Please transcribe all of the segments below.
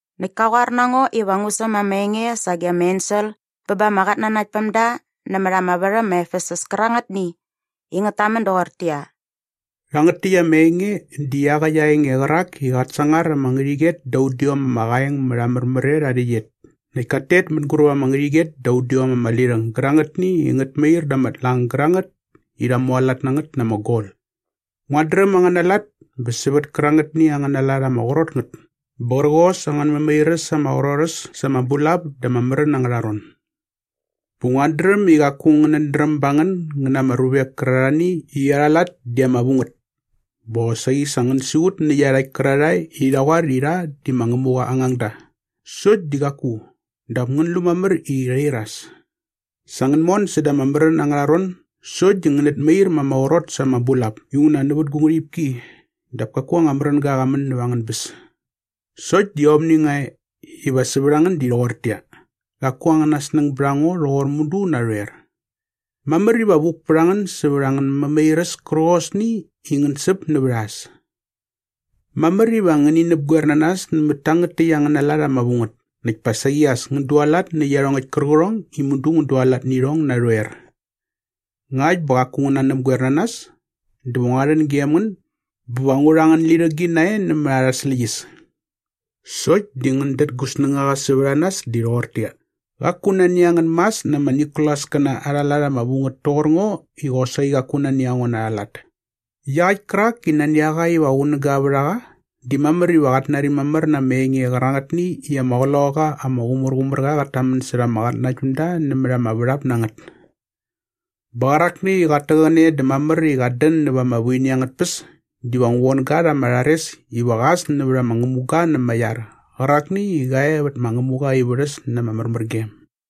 Näkt ka qoar na ngo iva ngu säm ama enge sage ama ensel bä ba ama qatnanaktpämda nämät ama värhäm ma Efesus kärangätni i ngät tamän doqortäqyia, “Rhangät täkt ama enge di iaqäkt aa enge qärak i qat sangar ama ngärhäqyet da udiom ama qaeng mät aa märmär et aa rhäqyet näkt kat tet mänguräp ama ngärhäqyet da udiom ama lirhäng gärangätni i ngät mair da ama tlang gärangät i rha mualat na ngät na ama gol. “Nguat dräm angäna lat bä sävät kärangätni angäna lat ama qrot ngät bä qärqos angän mämairäs ama qrot äs sa ama bulap da ama märän angärha ron. Bä nguat dräm i qaku ngänät dräm ba ngän ngän na ama ruvek kärarhani i arha lat di ama vu ngät bä qosaqi sa ngän siqut nä iarhakt kärarhae i rha qoar i rha di ma Ngämuqa aa ngangda sokt di qaku dap ngän lu mamär i rhi iras. Sa ngän mon säda ama märän angärha ron sokt di ngänät mair ma ama qrot sa ama bulap inguna nävät gu ngärhipki dap kaku anga märänga qa män näva angän bäs. “Sokt di aomni nga e iva sävät a ngän di rhoqortäqyia, qaku angäna snäng bät a ngo rhoqor mudu narhoer. Mamär iva vuk pät a ngän sävät angän mämairäs kärqosni i ngän säp nävät a äs. Mamär iva ngäni näpgoer na nas nämät tangät täkt angäna lat ama vu ngät näkt pa saqi as ngän dualat nä iarhongäkt kärqärhong i mudu ngän dualat nä irhong narhoer. Ngakt bä qaku ngän nanäpgoer na nas dä va ngua rhän gem ngän bä va ngu rha angän lirhägi nae nämät arha släqyäs. Sokt di ngän dät gu snängaqa sävät a nas di rhoqortäqyia, ‘Qaku nani a ngän mas na ama Nikolaskäna arha lat ama vu ngät toqor ngo i qosaqi qaku nani a ngo na arha lat.’ “Iaqäkt kärak i nani a qa iva qunäga vät a qa di mamär iva qat nari mamär na ama enge qärangätni i ama Qloqaqa ama Qumärqumärqa qat tamän särha ama qatnanaktpämda nämät ama värhap na ngät. Bä qärakni i qat täqäne dä mamär i qat dän näva ama vuini angät tpäs diva ngu von ga rha ama rhares iva qa äs nävät ama ngämuga na ama iar qärakni i qa e vät ma Ngämuqa aa ivärhäs na ama märmärgem.”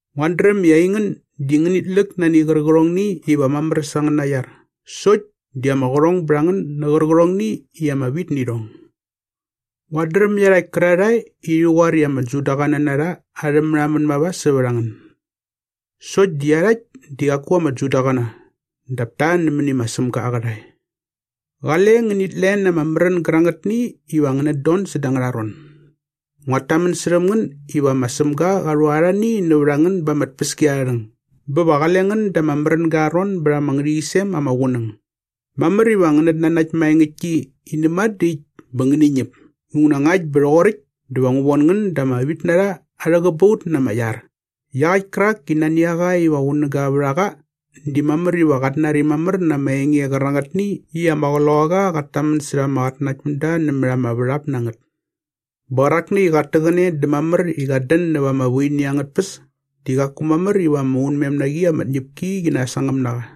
“Nguat dräm i aingän di ngänit läk nani qärqärhongni iva mamär sa angäna iar sokt di ama qärhong bät a ngän nä qärqärhongni i ama vit nä irhong. Nguat dräm iarhakt kärarhae i rhi qoar i ama Judaqäna na rha arhä märhamän mava sävät a ngän. Sokt di iarhakt di qaku ama Judaqäna dap ta nämäni ma Sämga aa qärhae. “Qale ngänit len ama märän gärangätni iva ngänät don säda angärha ron. Nguat tamän särhäm ngän iva ma Sämga qa rhu arhani nävät a ngän ba ama tpäskiarharhäng bä va qale ngän da ama märänga aa ron bät ama ngärhäqyisem ama qunäng. Mamär iva ngänät nanakt maengäktki i näma dä äkt bä ngäni ñäp inguna ngakt bä rhoqoräkt dä va ngu von ngän da ama vitnarha arhä qäbaut na ama iar. “Iaqäkt kärak i nani a qa iva qunäga vät a qa di mamär iva qat nari mamär na ama enge qärangätni i ama Qloqaqa qat tamän särha ama qatnanaktpämda nämät ama värhap na ngät. Bä qärakni i qat täqäne dä mamär i qat dän näva ama vuini angät tpäs di qaku mamär iva ama unmem na qi ama tñäpki qi nasangäm na qa.”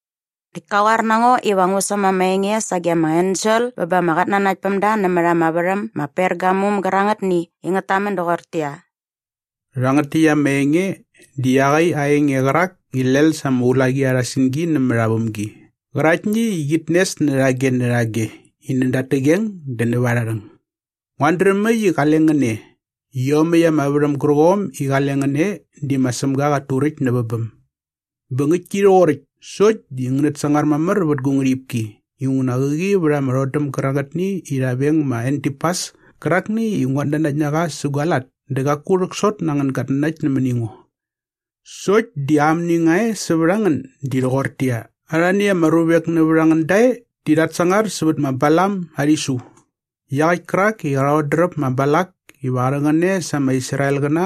Näkt ka qoar na ngo iva ngu säm ama enge sage ama ensel bä ba ama qatnanaktpämda nämät ama värhäm ma Pergamum gärangätni i ngät tamän doqortäqyia, “Rhangät täkt ama enge di iaqäkt aa enge qärak i lel sa ama ulaqi arha singi nämät aa vämgi qäraktni i qit nes närhage närhage i näda at täqeng dä näva arha rhäng. “Nguat dräm äkt i qale ngän e. Iomäkt ama värhäm gärqom i qale ngän e di ma Sämga qat turäkt nävä bäm. Bä ngäktki rhoqoräkt sokt di ngänät sangar mamär vät gu ngärhipki inguna qäqi vät ama rhodäm gärangätni rha veng ma Antipas kärakni i nguat nanakt na qa sä gua lat dä qaku rhäksot na angän gatnanakt nämäni ngo. “Sokt di amni nga e sävät a ngän di rhoqortäqyia, arhani ama ruvek nävät a ngän da e di rhat sangar sävät ma Balam aa rhisu iaqäkt kärak i qa rhodräp ma Balak iva qa rhäqäne sa ama Israelqäna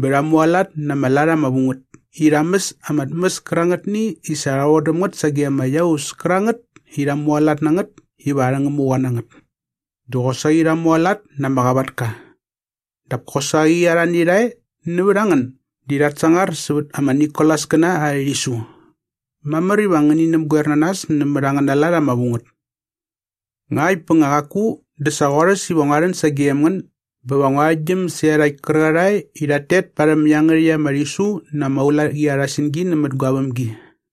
bä rha mualat na ama lat ama vu ngät i rha mäs ama tmäs kärangätni i sa rha vodäm ngät sage ama iaus kärangät i rha mualat na ngät iva arhä ngämuqa na ngät. Dä qosaqi rha mualat na ama qavatka. Dap kosaqi arhani rha e nävät a ngän di rhat sangar sävät ama Nikolaskäna arhä rhisu. Mamär iva ngäni näpgoer na nas nämät angäna lat ama vu ngät. Ngakt bä nga qaku dä sa qorhäs iva ngua rhän sagem ngän bä va ngu arhäktgyäm sä iarhakt kärarhae i rhat tet parhäm iangärhäkt ama rhisu na ama ulaqi arha singi nämät gua vämgi.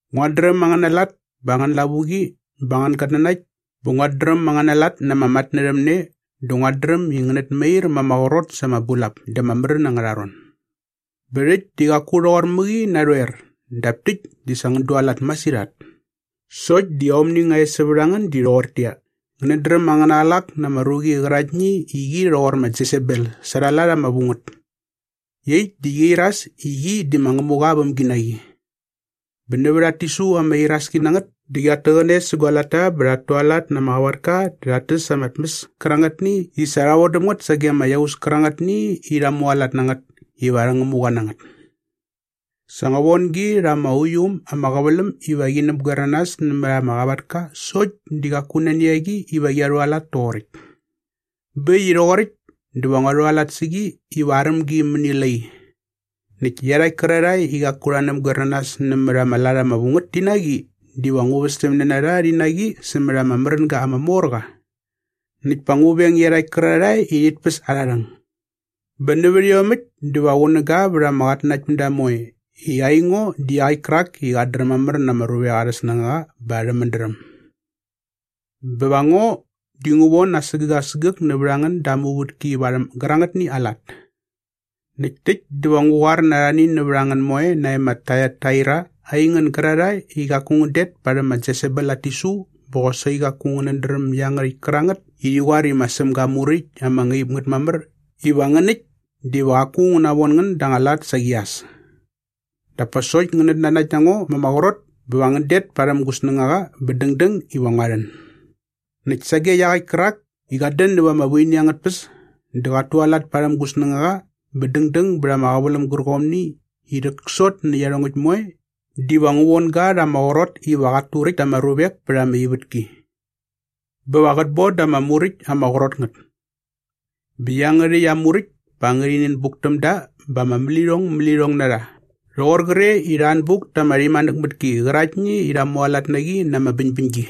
“Nguat dräm angäna lat bä angän lavuqi bä angän gatnanakt bä nguat dräm angäna lat na ama matnärhämne dä nguat dräm i ngänät mair ma ama qrot sa ama bulap da ama märän angärha ron. Bä rhäkt di qaku rhoqor mäqi narhoer dap täkt di sa ngän dualat masirhat. Sokt di aomni nga e sävät a ngän di rhoqortäqyia, ngänät dräm angäna qlak nä ama ruqi qäraktni i qi rhoqor ma Jesebel sa arha lat ama vu ngät. Iaqyäkt di qia iras i qi di ma Ngämuqa aa vämginaqi. Bä nävät at tisu ama iraski na ngät dä qiat täqäne sä gua latta bä rhat tualat na ama qavatka dä rhat täs ama tmäs kärangätni i sa rha vodäm ngät sage ama iaus kärangätni i rha mualat na ngät iva arhä ngämuqa na ngät. Sa ngua von gi rha ama uiu äm ama qäväläm iva qi näpgoer na nas nämät ama qavatka sokt di qaku nani a qi iva qia rhualat toqoräkt. “Bä äkt i rhoqoräkt dä va ngua rhualat sä qi iva aräm gi mäni lai. Näkt iarhakt kärarhae i qaku rha näpgoer na nas nämät ama lat ama vu ngät ti na qi diva ngu västämne na rha rhi na qi sämät ama märänga ama mor qa. Näkt pa ngu veng iarhakt kärarhae i rhit päs arha rhäng. Bä nävät iomäkt dä va qunäga vät ama qatnanaktpämda moe i aingo di iaqäkt kärak i qat dräm mamär na ama ruvek arhä snängaqa bä arhä mädräm. Bä va ngo di ngu von asägäk asägäk nävät a ngän da aa muvätki varhäm gärangätni aa lat. “Näkt täkt dä va ngu qoar na arhani nävät a ngän moe nae ma Taiataira aingän gärarhae i qaku ngän det parhäm ma Jesebel at tisu bä qosaqi qaku ngänät dräm iangärhäkt kärangät i rhi qoar i ma Sämga aa muräkt ama ngaip ngät mamär iva ngän äkt diva qaku ngu navon ngän da anga lat saqi as. Dap pa sokt ngänät nanakt na ngo ma ama qrot bä va ngän det parhäm gu snängaqa bä dängdäng iva ngua rhän. “Näkt sage iaqäkt kärak i qat dän näva ama vuini angät tpäs dä qat tualat parhäm gu snängaqa bä dängdäng bät ama qäväläm gärqomni i rhäksot nä iarhongäkt moe diva ngu von ga rha ama qrot iva qat turäkt ta ama ruvek pät ama ivätki. Bä va qät bon da rha ama muräkt ama qrot ngät. Bä iangärhäkt aa muräkt pa ngärhi nänbuk täm da bä ama mälirhongmälirhong na rha rhoqor qre i rha anbuk ta ama rhimanäkmatki qäraktni i rha mualat na qi na ama bäñbäñgi.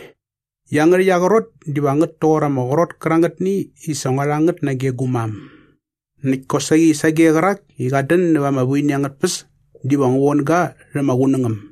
Iangärhäkt aa qrot diva ngät toqor ama qrot kärangätni i sa ngua rha ngät nage gu mam. Näkt kosaqi sage qärak i qat dän näva ama vuini angät tpäs diva ngu von ga rhä ma Qunängäm.